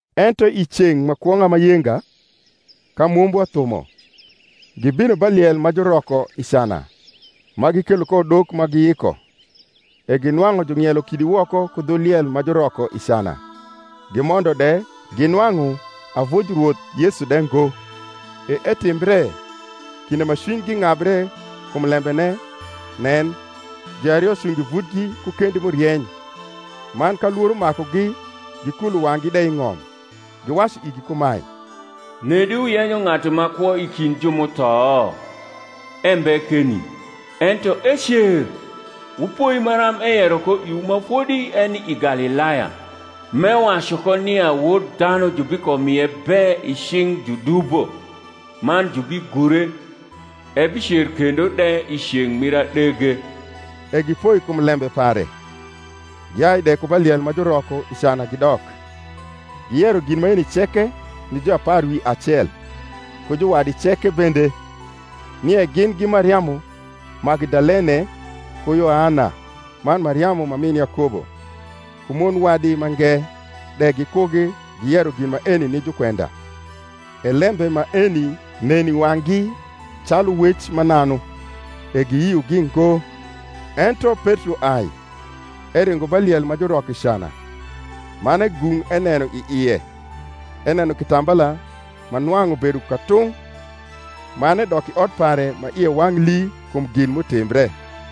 Ento i ceng’ ma kwong’a ma yenga, ka mombwa thumo, gibino ba liel ma juroko i cana, ma gikelo ko udok ma giyiko. E ginwang’u jung’ielo kidi woko ku dhu liel ma juroko i cana. Gimondo de, ginwang’u avuj Rwoth Yesu de ngo. E etimbre, kinde ma cwinygi ng’abre kum lembene, nen, juario cungo i vutgi ku kendi m’urieny: man ka lworo makugi gikulo wang’gi de i ng’om, giwacu igi kumae, Nedi wuyenyo ng’atu ma kwo i kind ju m’utho? Embe keni, ento ecer: wupoi maram eyero ko iwu ma fodi eni i Galilaya, m’ewacu ko nia Wod dhanu jubikomie be i cing’ judubo, man jubigure, ebicer kendo de i ceng’ mir adege. E gipoi kum lembe pare, giai de ku ba liel ma juroko i cana gidok, giyero gin maeni ceke ni juapar wi acel, ku juwadi ceke bende. Nie gin gi Mariamu Magdalene, ku Yoana, man Mariamu ma min Yakobo: ku mon wadi mange de gikugi giyero gin maeni ni jukwenda. E lembe maeni nen i wang’gi calu wec mananu; e giyiogi ngo. Ento Petro ai, eringo ba liel ma juroko i cana; man egung’ eneno i ie, eneno kitambala ma nwang’ ubedo katung’; man edok i ot pare, ma ie wang’ lii kum gin m’utimbre.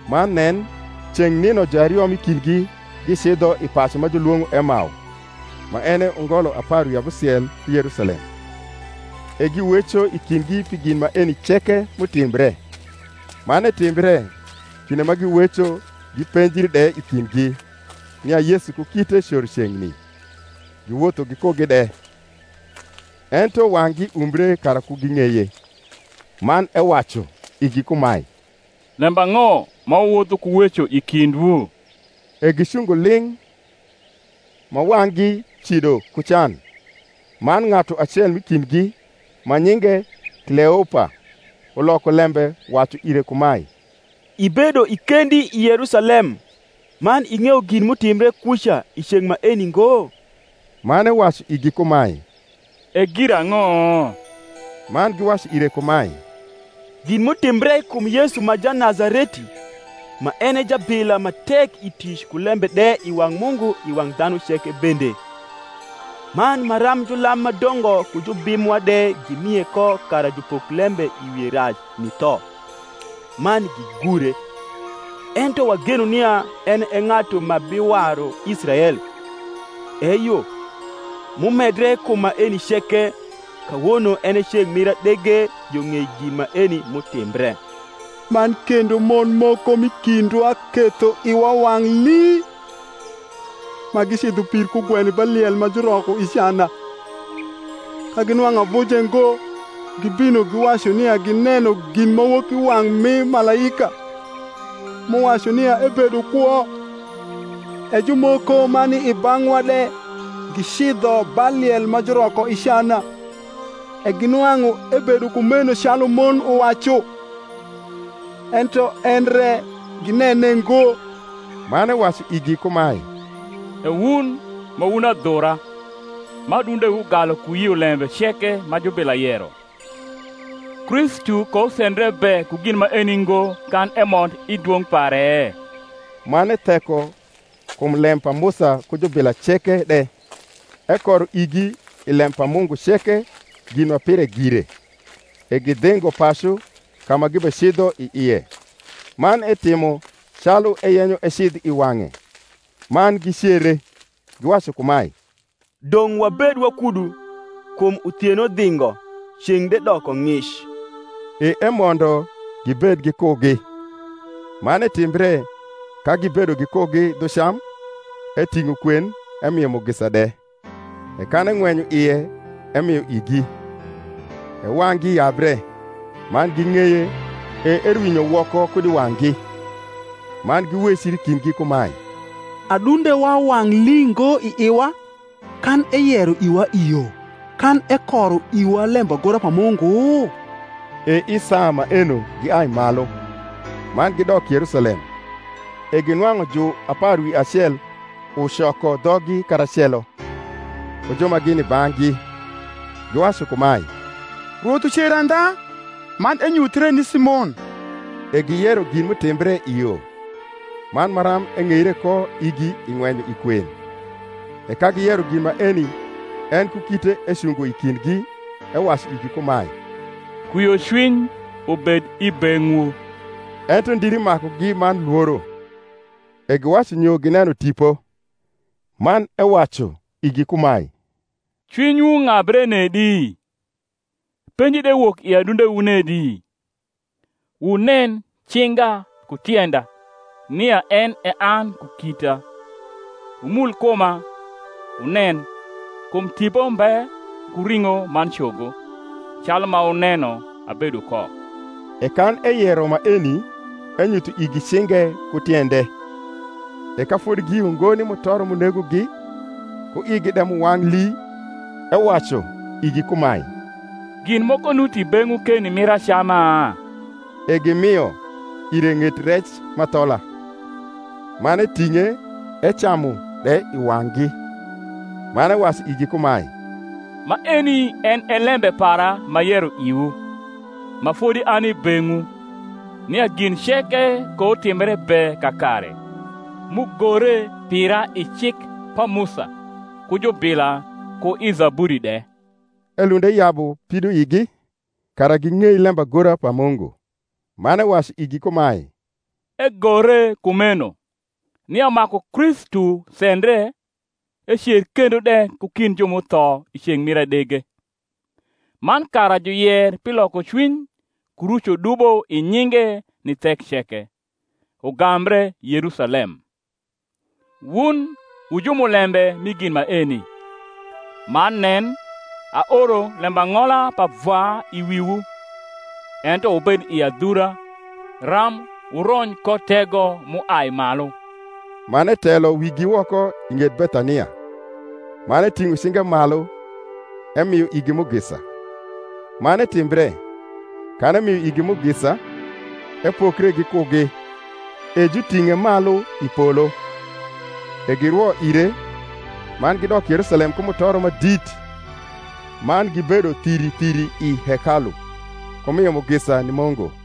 Man nen, ceng’ nino juario m’i kindgi gicidho i pacu ma julwong’o Emao, ma en e ungolo apar wi abusiel ku Yerusalem. E giweco i kindgi pi gin maeni ceke m’utimbre. Man etimbre, kinde ma giweco gipenjri de i kindgi, nia Yesu ku kite coro ceng’ni, giwotho gikugi de. Ento wang’gi umbre kara ku ging’eye. Man ewacu igi kumae, Lembang’o ma wuwotho ku weco i kindwu? E gicungo ling’, ma wang’gi cido ku can. Man ng’atu acel m’i kindgi, ma nyinge Kleopa, uloko lembe wacu ire kumae, Ibedo i kendi i Yerusalem man ing’eyo gin m’utimbre kuca i ceng’ maeni ngo? Man ewacu igi kumae, E girang’o? Man giwacu ire kumae, Gin m’utimbre kum Yesu ma Janazareti, ma en e jabila ma tek i tic ku lembe de i wang’ Mungu i wang’ dhanu ceke bende: man maram julam ma dongo ku jubim mwa de gimie ko kara jupok lembe i wie rac ni tho, man gigure. Ento wageno nia en e ng’atu ma biwaru Israel. Eyo m’umedre kum maeni ceke, kawono en e ceng’ mir adege yo ng’ei gin maeni m’utimbre. Man kendo mon moko m’i kindwa ketho iwa wang’ lii, ma gicidho pir kugweno ba liel ma juroko i cana; ka ginwang’u avuje ngo, gibino, giwacu nia gineno ginmawokiwang’ mi malaika, m’uwacu nia ebedo kwo. E jumoko ma ni i bang’wa de gicidho ba liel ma juroko i cana, e ginwang’u ebedo kumeno calu mon uwacu: ento en re ginene ngo. Man ewacu igi kumae, E wun ma wun adhura, ma adundewu galu ku yio lembe ceke ma jubila yero! Kristu kousendre be ku gin maeni ngo kan emond i dwong’ pare? Man etheko kum lem pa Musa ku jubila ceke de, ekoro igi i lem pa Mungu ceke gin ma pire gire. E gidhingo pacu, ka ma gibecidho i ie: man etimo calu eyenyo ecidh i wang’e. Man gicere, giwacu kumae, Dong’ wabed wakudu; kum uthieno dhingo, ceng’ de doko ng’ic. E emondo gibed gikugi. Man etimbre, ka gibedo gikugi dhu cam, eting’o kwen emio mugisa de; e kan eng’wenyo ie emio igi. E wang’gi yabre, man ging’eye; e erwinyo woko kud i wang’gi. Man giwecri i kindgi kumae, Adundewa wang’ lii ngo i iwa, kan eyero iwa i yo, kan ekoro iwa lembagora pa Mungu? E i saa maeno giai malu, man gidok Yerusalem, e ginwang’u juapar wi acel ucoko dhoggi karacelo, ku ju ma gini i bang’gi, giwacu kumae, Rwoth ucer andha, man enyuthie ni Simon. E giyero gin m’utimbre i yo, man maram eng’eire ko igi i ng’wenyo i kwen. E ka giyero gin maeni, en ku kite ecungo i kindgi, ewacu igi kumae, Kwiocwiny ubed i beng’wu. Ento ndiri makugi man lworo, e giwacu nyo gineno ripo. Man ewacu igi kumae, Cwinywu ng’abre nedi? penji de wok i adundewu nedi? Wunen cinga ku tienda, nia en e an ku kita: wumul kuma, wunen; kum tipo mbe ku ring’o man cogo, calu ma wuneno abedo ko. E kan eyero maeni, enyutho igi cinge ku tiende. E ka fodi giyio ngo ni mutoro m’unegogi, ku igi de m’uwang’ lii, ewacu igi kumae, Gin moko nuti beng’wu keni mir acama? E gimio ire ng’et rec m’athola. Man eting’e, ecamu de i wang’gi. Man ewacu igi kumae, Maeni en e lembe para m’ayero iwu, ma fodi ani i beng’wu, nia gin ceke koutimbre be kakare, m’ugore pira i cik pa Musa, ku jubila, ku i zaburi de. Elund eyabu pidoigi, kara ging’ei lembagora pa Mungu; man ewacu igi kumae, Egore kumeno, nia maku Kristu sendre, ecer kendo de ku kind ju m’utho i ceng’ mir adege; man kara juyer pi lokocwiny ku rucodubo i nyinge ni thek ceke, ugambre Yerusalem. Wun wu jumulembe mi gin maeni. Man nen, aoro lembang’ola pa Vwa i wiwu; ento wubed i adhura, ram wurony ko tego m’uai malu. Man etelo wigi woko i ng’et Bethania: man eting’o cinge malu, emio igi mugisa. Man etimbre, kan emio igi mugisa, epokre gikugi, e juting’e malu i polo. E girwo ire, man gidok Yerusalem ku mutoro ma dit: man gibedo thiri thiri i hekalu, ku mio mugisa ni Mungu.